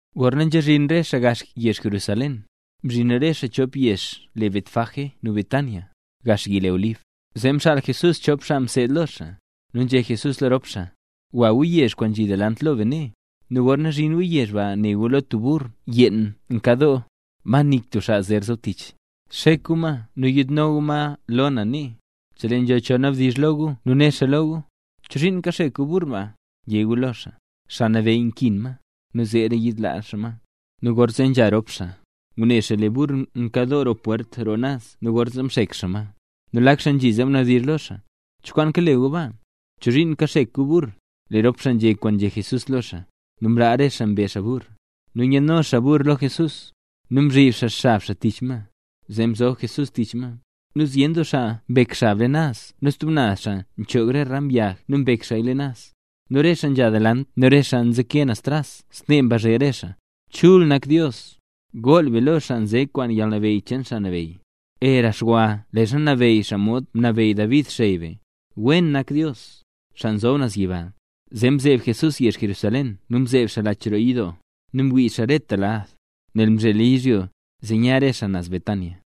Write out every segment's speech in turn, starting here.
Gorna nzhazhin re xaa gaxla yezh Jerusalén, mzhin re xaa chop yezh le Betfagé nu Betania, gax yi le Olib, zee mxaal Jesús chop xaa mseed lo xaa, nu nzhé Jesús lo rop xaa: —Gwa gu yezh kwaan nzhi delant lo be nee. Nu gorna zhin gu yezh ba, ne gu lee tub burr yeen nkadoo, ma nik tub xaa zer zob tich. Xek gu ma nu yiidno gu ma lo na nee. Chelee nzho cho nabdizh lo gu nu né xaa lo gu: “¿Chozhiin kaxek gu burr ba?”, yé gu lo xaa: “Xaa Nabeyy nkin ma, nu zeera yiidlaa xaa ma”. Nu gorna nzha rop xaa, ngune xaa lee burr nkadoo roo pwert roo naz nu gorzee mxek xaa ma. Nu lak xaa nzhi zee mnabdizh lo xaa: —¿Cho kwaan kale gu baa? ¿Chozhiin kaxek gu burr? Lee rop xaa nzhé kwaan nzhé Jesús lo xaa, nu mlaa re xaa mbe xaa burr. Nu nyaadno xaa burr lo Jesús, nu mzhib xaa xab xaa tich ma, zee mzob Jesús tich ma. Nu zyen doo xaa mbek xab leen naz nu stub naz xaa nchoog re ram yag nu mbek xaaya leen naz. Nu re xaa nzha delant nu re xaa nzeke naz tras snee mbazhe re xaa: —¡Chul nak Dios! ¡Gool be lo xaa nze kwaan yalnabeyy cheen Xaa Nabeyy! ¡Era xwa leezha nabeyy xaa modxa mnabeyy David, xey be! ¡Wen nak Dios, xaa nzob naz yiba! Zee mzeeb Jesús yezh Jerusalén nu mzeeb xaa lach roo yidoo, nu mwii xaa reta lad. Nel mzhela yizhyo, zee nya re xaa naz Betania.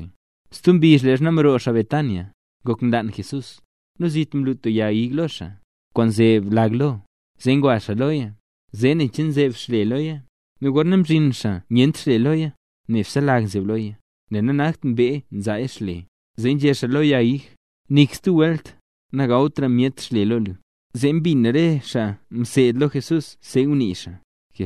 Stub mbizh leezha mroo xaa Betania, ngok nlaan Jesús. Nu zit mlu tub yag ig lo xaa, kwaan nzeb lag lo, zee ngwa xaa loya, zee ne xaa nen che nzeb xle loya. Nu gorna mzhin xaa nyent xle loya, nebse lag nzeb loya, nel nanakt mbee nzaa xle. Zee nzhé xaa lo yag ig: —Nik stub welt, nagawtra myet xle lo lu. Nu mbin re xaa mseed lo xaa see ngunii xaa.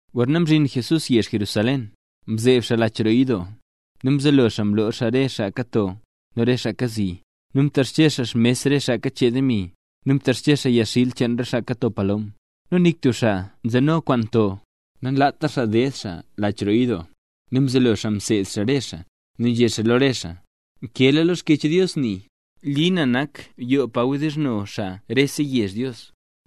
Gorna mzhin Jesús yezh Jerusalén, mzeeb xaa lach roo yidoo, nu mzelo xaa mloo xaa re xaa kato, nu re xaa kazi. Nu mtexche xaa xmes re xaa kachee demi, nu mtexche xaa yagxil cheen re xaa kato palom. Nu nik tub xaa nzeno kwaan to, nanlaat xaa ded xaa lach roo yidoo. Nu mzelo xaa mseed xaa re xaa, nu nzhé xaa lo re xaa: —Nkeela lo Xkyech Dios nii: “Li na nak yoo pa wdizhno xaa rese yezh Dios”;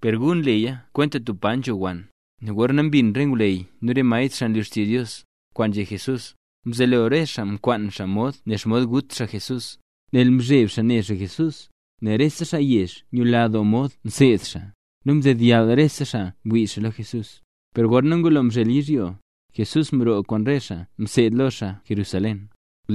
per gu mleya kwenta tub pa nzho wann. Nu gorna mbin re ngwleyy nu re maestr xaa nlu xtizh Dios, kwaan nzhé Jesús, mzelo re xaa mkwaan mod nen xomod gut xaa Jesús, nel nzheb xaa ne xaa Jesús, nel rese xaa yezh nyula doo mod nseed xaa, nu mdedyall rese xaa ngwii xaa lo xaa. Per gorna ngulo mzhel yizhyo, Jesús mroo kwaan re xaa mseed lo xaa Jerusalén.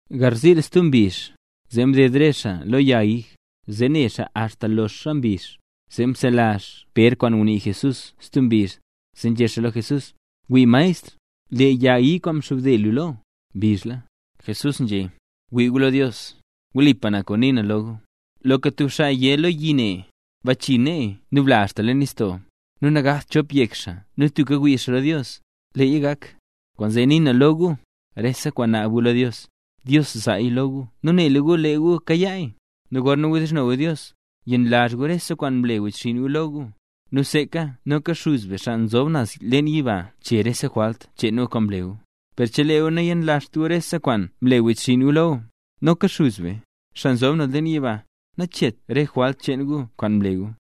Garziil, stub mbizh, zee mded re xaa lo yag ig, zee ne xaa axta loxa mbizh. Zee mselazh Pér kwaan ngunii Jesús stub mbizh, zee nzhé xaa lo Jesús: —Wii maestr. Lee yag ig kwaan mxobde lu lo, mbizhla. Jesús nzhé: —Wii gu lo Dios. Wlipa na kwaan nii na lo gu. Loka tub xaa yé lo yi ne: “Bachii nee nu bla axta leen nistoo”, nu nagakt chop yek xaa nu tubka ngwii xaa lo Dios, leeya gak. Kwaanzee nii na lo gu, rese kwaan naab gu lo Dios, Dios zaaya lo gu, nu nela gu lee gu kayaaya. Nu gorna wdizhno gu Dios, yenlazh gu rese kwaan mle wechxinn gu lo gu, nu seeka noka Xuz be, xaa nzob naz leen yiba chee rese jwalt cheen gu kwaan mle gu. Per chelee gu nayenlazht gu rese kwaan mle wechxinn gu lo gu, noka Xuz be, xaa nzob naz leen yiba, nacheet re jwalt cheen gu kwaan mle gu.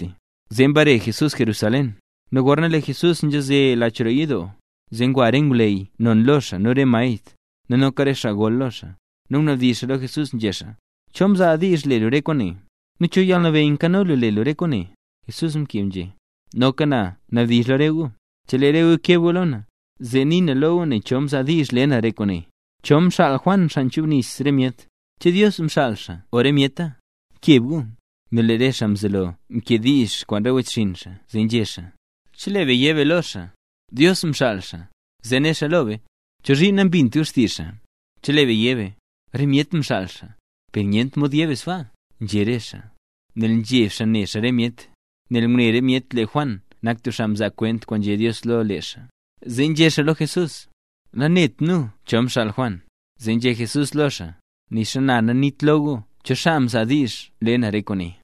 Zee mbare Jesús Jerusalén, nu gorna lee Jesús nzhaze lach roo yidoo, zee ngwa re ngwleyy non lo xaa, nu re maestr, nu noka re xaa gol lo xaa. Nu mnabdizh xaa lo Jesús nzhé xaa: —¿Cho mzaa diizh le lu re kwaane?, nu ¿cho yalnabeyy nkano lu le lu re kwaane? Jesús mkeb nzhé: —Noka na nabdizh lo re gu. Chelee re gu keb gu lo na, zee nii na lo gu nen cho xaa mzaa diizh le na re kwaane. ¿Cho mxaal Juan xaa mchubnis re myet? ¿Che Dios mxaal xaa o re myeta? ¡Keb gu! Nu lee re xaa mzelo mkediizh kwaan re wechxinn xaa zee nzhé xaa: —Chelee be yé be lo xaa: “Dios mxaal xaa”, zee né xaa lo be: “¿Chozhiin nambint gu xtizh xaa?” Chelee be yé be: “Re myet mxaal xaa…”, per nyent mod yé be sbaa —nzhé re xaa. Nel nzheb xaa ne xaa re myet, nel ngune re myet lee Juan nak tub xaa mzaa kwent kwaan nzhé Dios lo lee xaa. Zee nzhé xaa lo Jesús: —Nanet nu cho xaa mxaal Juan. Zee nzhé Jesús lo xaa: —Nixa na naniit lo gu cho xaa mzaa diizh nle na re kwaane.